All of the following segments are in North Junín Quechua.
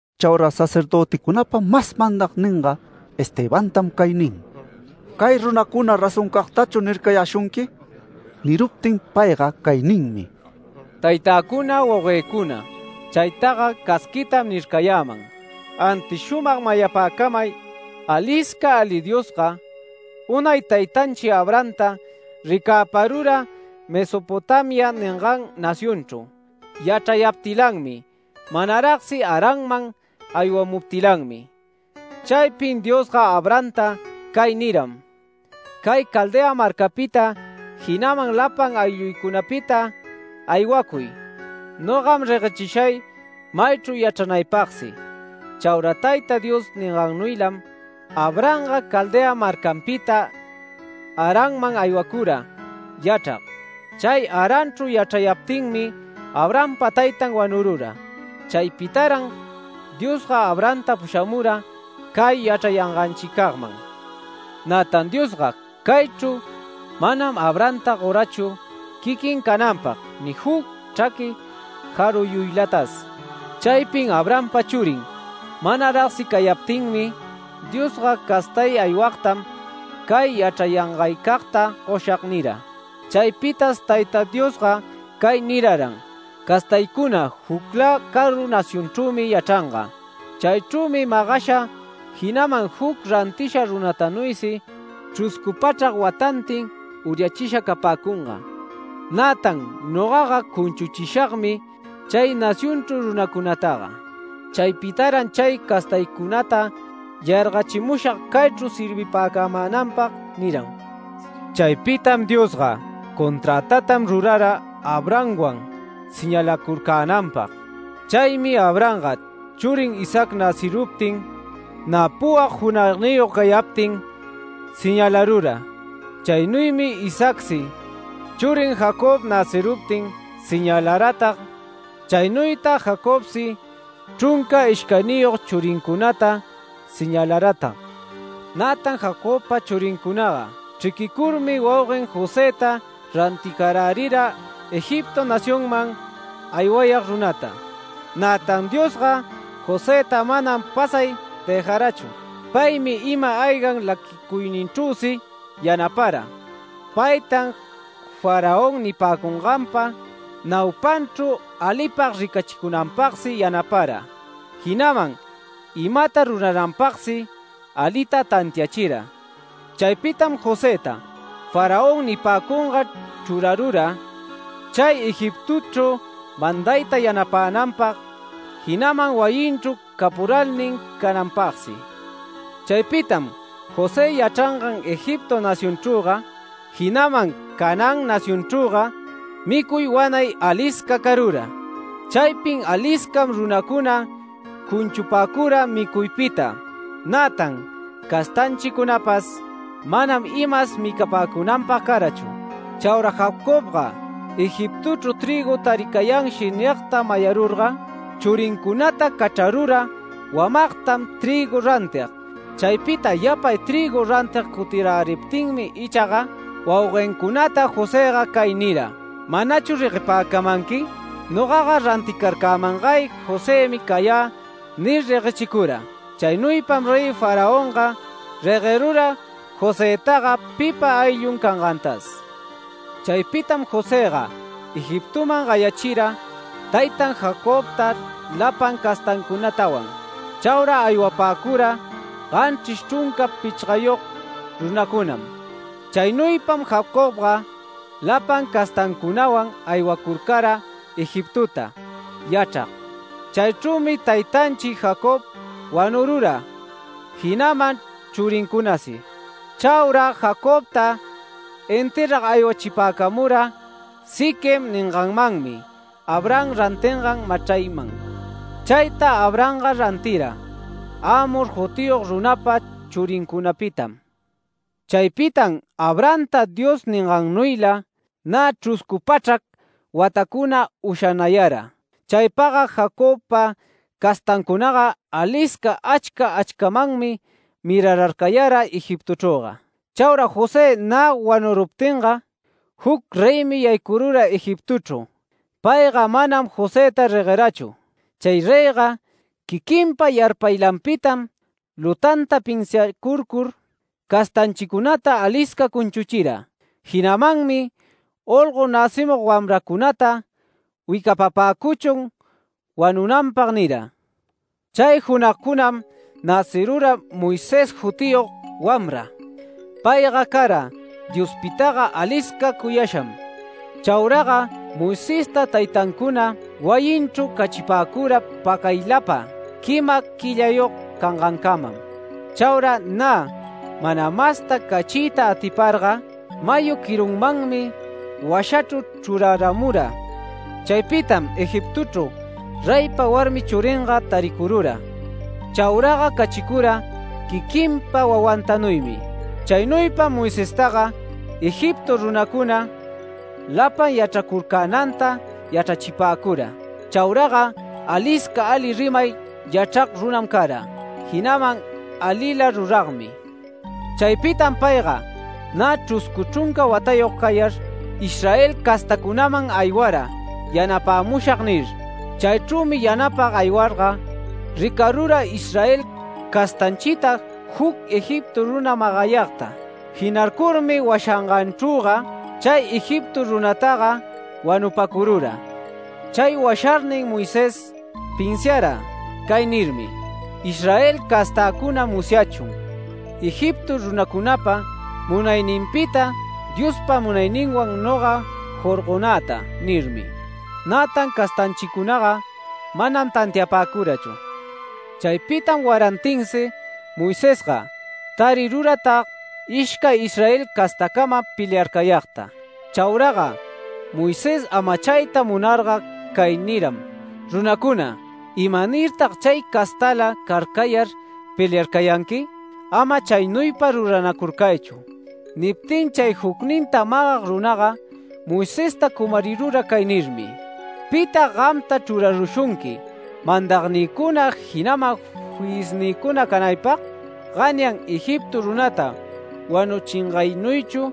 Chaura sacerdöticunapa mas mandagninga Estebantam cay nin: “¿Cay runacuna razoncagtachu nircayäshunqui?” Niruptin payga cay ninmi: “Taytäcuna, wauguëcuna, chaytaga casquitam nircayäman, antis shumag mayapäcamay: Alisca ali Diosga unay taytanchi Abrahamta ricäparura Mesopotamia ningan nacionchru yachrayaptilanmi, manaragsi Haranman aywamuptilanmi. Chaypin Diosga Abrahamta cay niram: ‘Cay Caldea marcaypita, jinaman lapan aylluycunapita aywacuy. Nogam reguechishay maychru yachranaypagsi’. Chaura Tayta Dios ningannuylam Abrahamga Caldea marcanpita Haranman aywacura yachrag. Chay Haranchru yachrayaptinmi Abrahampa taytan wanurura. Chaypitaran Diosga Abrahamta pushamura cay yachrayanganchicagman. Nätan Diosga caychru manam Abrahamta gorachu quiquin cananpag ni juc chraqui jaruyuylatas. Chaypin Abrahampa churin manaragsi cayaptinmi. Diosga ‘Castay aywagtam cay yachrayangaycagta goshag’ nira. Chaypitas Tayta Diosga cay niraran: ‘Castaycuna juclä caru nacionchrümi yachranga. Chaychrümi magasha, jinaman juc rantisha runatanuysi chruscu pachrac watantin uryachisha capäcunga. Nätan nogaga cunchuchishagmi chay nacionchru runacunataga. Chaypitaran chay castaycunata yargachimushag caychru servipäcamänanpag’ niram. Chaypitas Diosga conträtatam rurara Abrahamwan señalächicunanpag. Chaymi Abrahamga churin Isaac näciruptin, nä puwag junagniyog cayaptin señalarura. Chaynuymi Isaacsi churin Jacob näciramuptin señalaratag. Chaynuytan Jacobsi chrunca ishcayniyog churincunata señalaratag. Nätan Jacobpa churincunaga chriquicurmi wauguen Josëta ranticarärira Egipto nacionman aywayag runata. Nätan Diosga Josëta manam pasay dëjarachu. Paymi ima-ayga laquicuyninchrüsi yanapara. Paytan Faraón nipäcunganpa naupanmanchru alipag ricachicunanpagsi yanapara, jinaman imata rurananpagsi alita tantiachira. Chaypitam Josëta Faraón nipäcungan chrurarura chay Egiptochru mandayta yanapänanpag, jinaman wayinchru capuralnin cananpagsi. Chaypitam José yachrangan Egipto nacionchrüga, jinaman Canaán nacionchrüga micuy wanay alisca carura. Chaypin aliscam runacuna cunchupäcura micuypita. Nätan castanchicunapas manam imas micapäcunanpag carachu. Chaura Jacobga ‘Egiptochru trïgu taricayanshi’ nigta mayarurga, churincunata cachrarura wamagtam trïgu rantig. Chaypita yapay trïgu rantig cutiräriptinmi ichaga wauguencunata Josëga cay nira: ‘¿Manachu reguepäcamanqui? Nogaga ranticarcämangay Josëmi cayä’ nir, reguechicura. Chaynuypam Rey Faraonga reguerura Josëtaga pipa ayllun cangantas. Chaypitam Josëga Egiptoman gayachira taytan Jacobta lapan castancunatawan. Chaura aywapäcura ganchris chrunca pichgayog runacunam. Chaynuypam Jacobga lapan castancunawan aywacurcara Egiptota yachrag. Chaychrümi taytanchi Jacob wanurura, jinaman churincunasi. Chaura Jacobta enterrag aywachipäcamura Siquem ninganmanmi Abraham rantingan machrayman. Chayta Abrahamga rantira Hamor jutiyog runapa churincunapitam. Chaypitam Abrahamta Dios ningannuyla nä chruscu pachrac watacuna ushanayara. Chaypagga Jacobpa castancunaga alisca achca achcamanmi mirararcayara Egiptochrüga. Chaura José nä wanuruptinga juc reymi yaycurura Egiptochru. Payga manam Josëta reguerachu. Chay reyga quiquinpa yarpaylanpitam lutanta pinsiacurcur castanchicunata alisca cunchuchira. Jinamanmi ‘Olgo näcimug wamrancunata wicapapäcuchun wanunanpag’ nira. Chay junagcunam näcirura Moisés jutiyog wamra. Payga cara Diospitaga alisca cuyasham. Chauraga Moisesta taytancuna wayinchru cachipäcura pacaylapa quima quillayog cangancamam. Chaura nä mana masta cachiyta atiparga, mayu quirunmanmi washachru chruraramura. Chaypitam Egiptochru reypa warmi churinga taricurura. Chauraga cachicura quiquinpa wawantanuymi. Chaynuypam Moisestaga Egipto runacuna lapan yachracurcänanta yachrachipäcura. Chauraga alisca ali rimay yachrag runam cara, jinaman alila ruragmi. Chaypitam payga nä chruscu chrunca watayog cayar, Israel castancunaman aywara ‘Yanapämushag’ nir. Chaychrümi yanapag aywarga ricarura Israel castanchita juc Egipto runa magayagta. Jinarcurmi washanganchrüga chay Egipto runataga wanupacurura. Chay washarnin Moisés pinsiara cay nirmi: ‘Israel castäcuna musyachun Egipto runacunapa munayninpita Diospa munayninwan noga jorgonäta’ nirmi. Nätan castanchicunaga manam tantiapäcurachu. Chaypitam warantinsi Moisesga tariruratag ishcay Israel castacama peliarcayagta. Chauraga Moisés amachayta munarga cay niram: ‘Runacuna, ¿imanirtag chay castala carcayar peliarcayanqui? Ama chaynuypa ruranacurcaychu’. Niptinga chay jucninta magag runaga Moisesta cumarirura cay nirmi: ‘¿Pitag gamta chrurarushunqui mandagnïcuna, jinaman fiyisnïcuna canaypag? Ganyan Egipto runata wanuchingaynuychu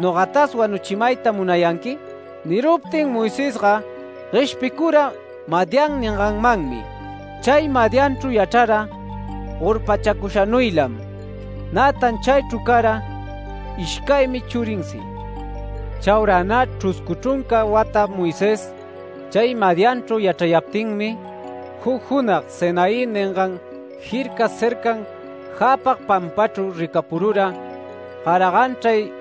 ¿nogatas wanuchimayta munayanqui?’ Niruptin Moisesga gueshpicura Madián ninganmanmi. Chay Madianchru yachrara gorpachacushanuylam. Nätan chaychru cara ishcaymi churinsi. Chaura nä chruscu chrunca wata Moisés chay Madianchru yachrayaptinmi, juc junag Sinaí ningan jirca cercan jäpag pampachru ricapurura garajanchray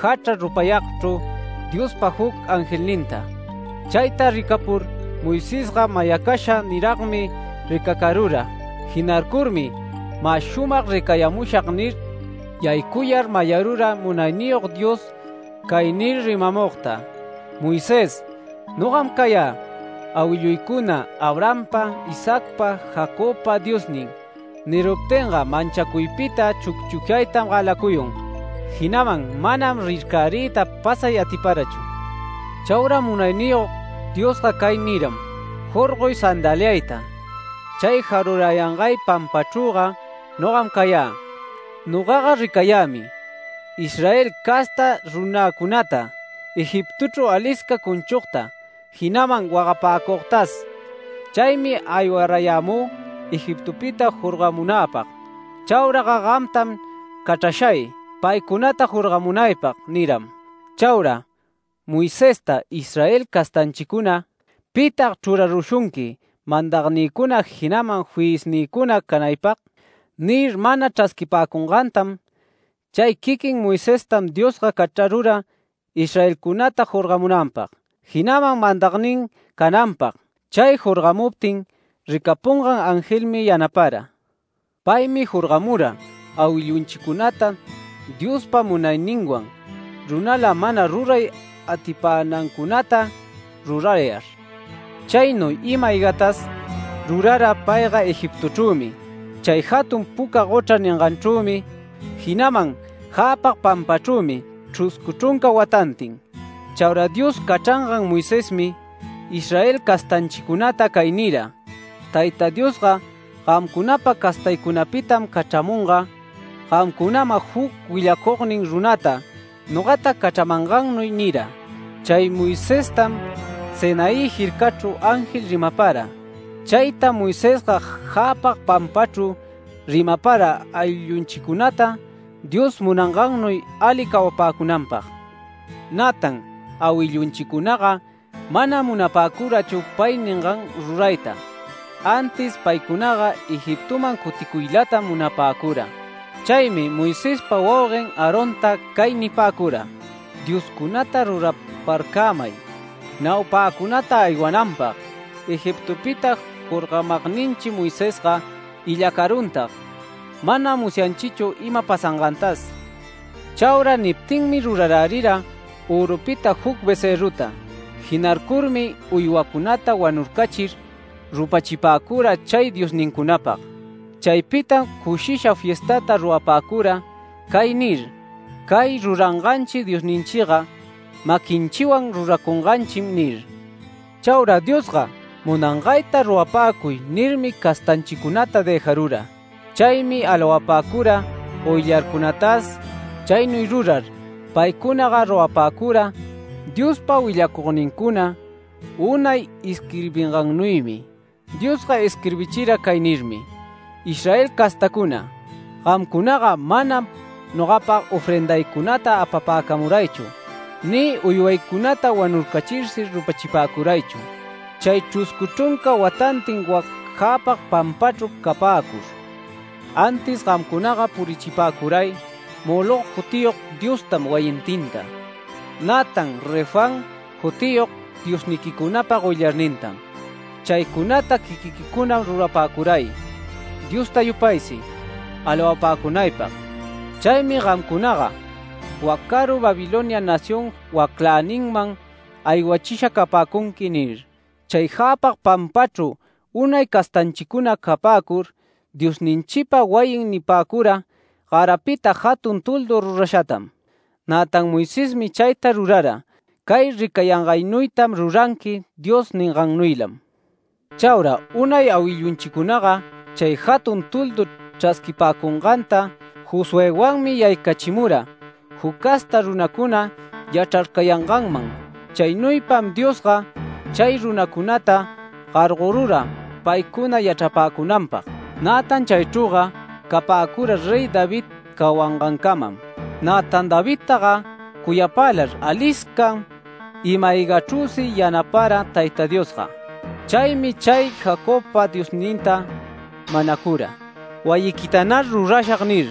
jachra rupayagchru Diospa juc angelninta. Chayta ricapur Moisesga mayacasha niragmi ricacarura. Jinarcurmi ‘Mä shumag ricayamushag’ nir yaycuyar mayarura Munayniyog Dios cay nir rimamugta: ‘Moisés, nogam cayä awilluycuna Abrahampa, Isaacpa, Jacobpa Diosnin’. Niruptinga manchacuypita chucchucyaytam galacuyun. Jinaman manam rircäriyta pasay atiparachu. Chaura Munayniyog Diosga cay niyanmi: ‘Jorgoy sandaliayta. Chay jarurayangay pampachrüga nogam cayä. Nogaga ricayämi Israel casta runäcunata Egiptochru alisca cunchugta, jinaman wagapäcugtas. Chaymi aywarayämü Egiptopita jorgamunäpag. Chauraga gamtam cachrashay paycunata jorgamunaypag’ niram. Chaura Moisesta Israel castanchicuna ‘¿Pitag chrurarushunqui mandagnïcuna jinaman fiyisnïcuna canaypag?’ nir, mana chrasquipäcungantam chay quiquin Moisestam Diosga cachrarura Israelcunata jorgamunanpag, jinaman mandagnin cananpag. Chay jorgamuptin ricapungan angelmi yanapara. Paymi jorgamura awillunchicunata Dios munayninwan runala mana ruray atipänancunata rurayar. Chaynuy ima-aygatas rurara payga Egiptochrümi, chay jatun Puca Gochra ninganchrümi, jinaman jäpag pampachrümi chruscu chrunca watantin. Chaura Dios cachrangan Moisesmi Israel castanchicunata cay nira: ‘Tayta Diosga gamcunapa castaycunapitam cachramunga gamcunaman juc willacugnin runata nogata cachramangannuy’ nira. Chay Moisestam Sinaí jircachru ángel rimapara. Chaytam Moisesga jäpag pampachru rimapara awillunchicunata Dios munangannuy ali cawapäcunanpag. Nätan awillunchicunaga manam munapäcurachu pay ningan rurayta, antis paycunaga Egiptoman cuticuylatam munapäcura. Chaymi Moisespa wauguen Aaronta cay nipäcura: ‘Dioscunata ruraparcämay naupäcunata aywananpag. Egiptopita jorgamagninchi Moisesga illacaruntag manam musyanchichu ima pasangantas’. Chaura niptinmi rurarärira örupita juc becërruta. Jinarcurmi uywacunata wanurcachir rupachipäcura chay diosnincunapag. Chaypitam cushisha fiestata rurapäcura cay nir: ‘Cay ruranganchi diosninchiga maquinchiwan ruracunganchim’ nir. Chaura ‘Diosga munanganta rurapäcuy’ nirmi, castanchicunata dëjarura. Chaymi alawapäcura goyllarcunatas. Chaynuy rurar paycunaga rurapäcura Diospa willacugnincuna unay isquirbingannuymi. Diosga isquirbichira cay nirmi: ‘Israel castacuna, gamcunaga manam nogapag ofrendaycunata apapäcamaraychu ni uywaycunata wanurcachirsi rupachipäcuraychu, chay chruscu chrunca watantin wac jäpag pampachru capäcur. Antis gamcunaga purichipäcuray Moloc jutiyog diostam wayintinta, nätan Refán jutiyog diosniquicunapa goyllarnintam. Chaycunata quiquiquicunam rurapäcuray, Diosta yupaysi alawapäcunaypag. Chaymi gamcunaga wac caru Babilonia nación wacläninman aywachisha capäcunqui’ nir. Chay jäpag pampachru unay castanchicuna capäcur Diosninchipa wayin nipäcura garapita jatun toldu rurashatam. Nätan Moisesmi chayta rurara ‘Cay ricayangaynuytam ruranqui’ Dios ningannuylam. Chaura unay awillunchicunaga, chay jatun toldu chrasquipäcunganta Josuëwanmi yaycachimura juc casta runacuna yachrarcayanganman. Chaynuypam Diosga chay runacunata gargorura paycuna yachrapäcunanpag. Nätan chaychrüga capäcura Rey David cawangancamam. Nätan Davidtaga cuyapälar aliscam ima-aygachrüsi yanapara Tayta Diosga. Chaymi chay Jacobpa Diosninta manacura: ‘Wayiquitanar rurashag’ nir.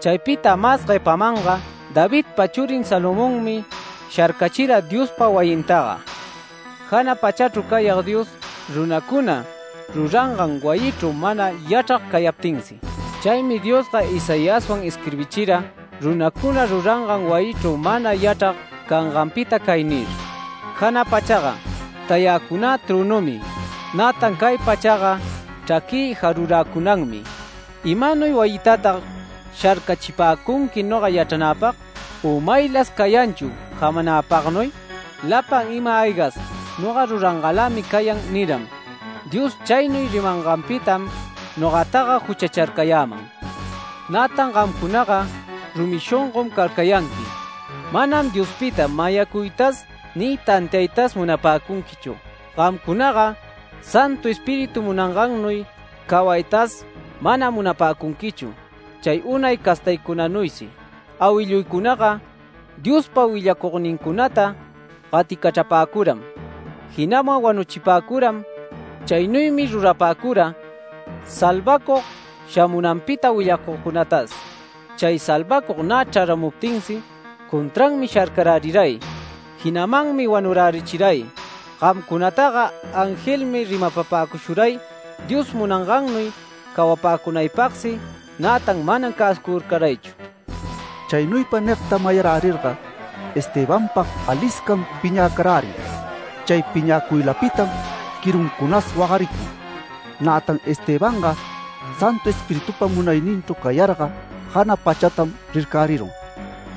Chaypita mas guepamanga Davidpa churin Salomonmi sharcachira Diospa wayintaga, jana pachachru cayag Dios runacuna rurangan wayichru mana yachrag cayaptinsi. Chaymi Diosga Isaiaswan isquirbichira runacuna rurangan wayichru mana yachrag canganpita cay nir: ‘Jana pachaga tayäcunä trönümi, nätan cay pachaga chraquï jaruräcunanmi. ¿Imanuy wayitatag sharcachipäcunqui noga yachranäpag u maylas cayanchu jamanäpagnuy? Lapan ima-aygas noga rurangalämi cayan’ niram. Dios chaynuy rimanganpitam nogataga juchacharcayäman. Nätan gamcunaga rumi shongom carcayanqui. Manam Diospita mayacuytas ni tantiaytas munapäcunquichu. Gamcunaga Santu Espíritu munangannuy cawaytas manam munapäcunquichu chay unay castaycunanuysi. Awilluycunaga Diospa willacugnincunata gaticachrapäcuram, jinaman wanuchipäcuram. Chaynuymi rurapäcura salvacug shamunanpita willacugcunatas. Chay salvacug nä chraramuptinsi contranmi sharcaräriray, jinamanmi wanurärichiray. Gamcunataga angelmi rimapapäcushuray Dios munangannuy cawapäcunaypagsi, nätan manam cäsucurcaraychu”. Chaynuypa nigta mayarärirga Estebanpag aliscam piñäcarärin. Chay piñäcuylapitam quiruncunas wagaricun. Nätan Estebanga Santu Espiritupa munayninchru cayarga jana pachatam rircärirun.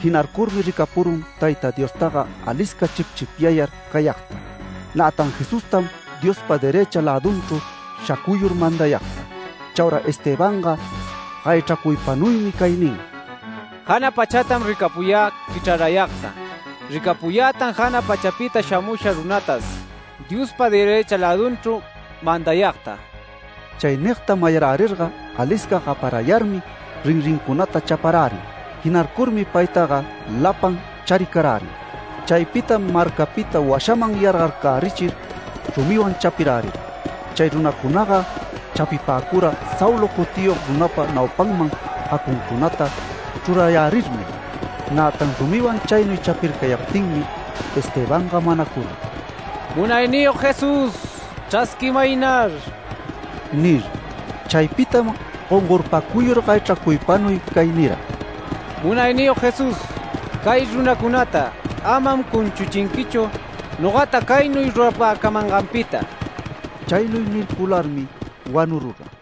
Jinarcurmi ricapurun Tayta Diostaga alisca chipchipyar cayagta, nätan Jesustam Diospa derëcha lädunchru shacuyur mandayagta. Chaura Estebanga gayachracuypanuymi cay nin: “Jana pachatam ricapuyä quichrarayagta. Ricapuyätan jana pachapita shamusha runatas Diospa derëcha lädunchru mandayagta”. Chay nigta mayarärirga alisca gaparayarmi rinrincunata chaparärin. Jinarcurmi paytaga lapan charicarärin. Chaypitam marcapita washaman yargarcärichir rumiwan chapirärira. Chay runacunaga chapipäcura Saulo jutiyog runapa naupanman jacuncunata chrurayärirmi. Nätan rumiwan chaynuy chapircayaptinmi, Estebanga manacurun: “¡Munayniyog Jesús, chrasquimaynar!” nir. Chaypitam gongorpacuyur gayachracuypanuy cay nira: “Munayniyog Jesús, cay runacunata amam cunchuchinquichu nogata caynuy rurapäcamanganpita”. Chaynuy nircularmi wanurura.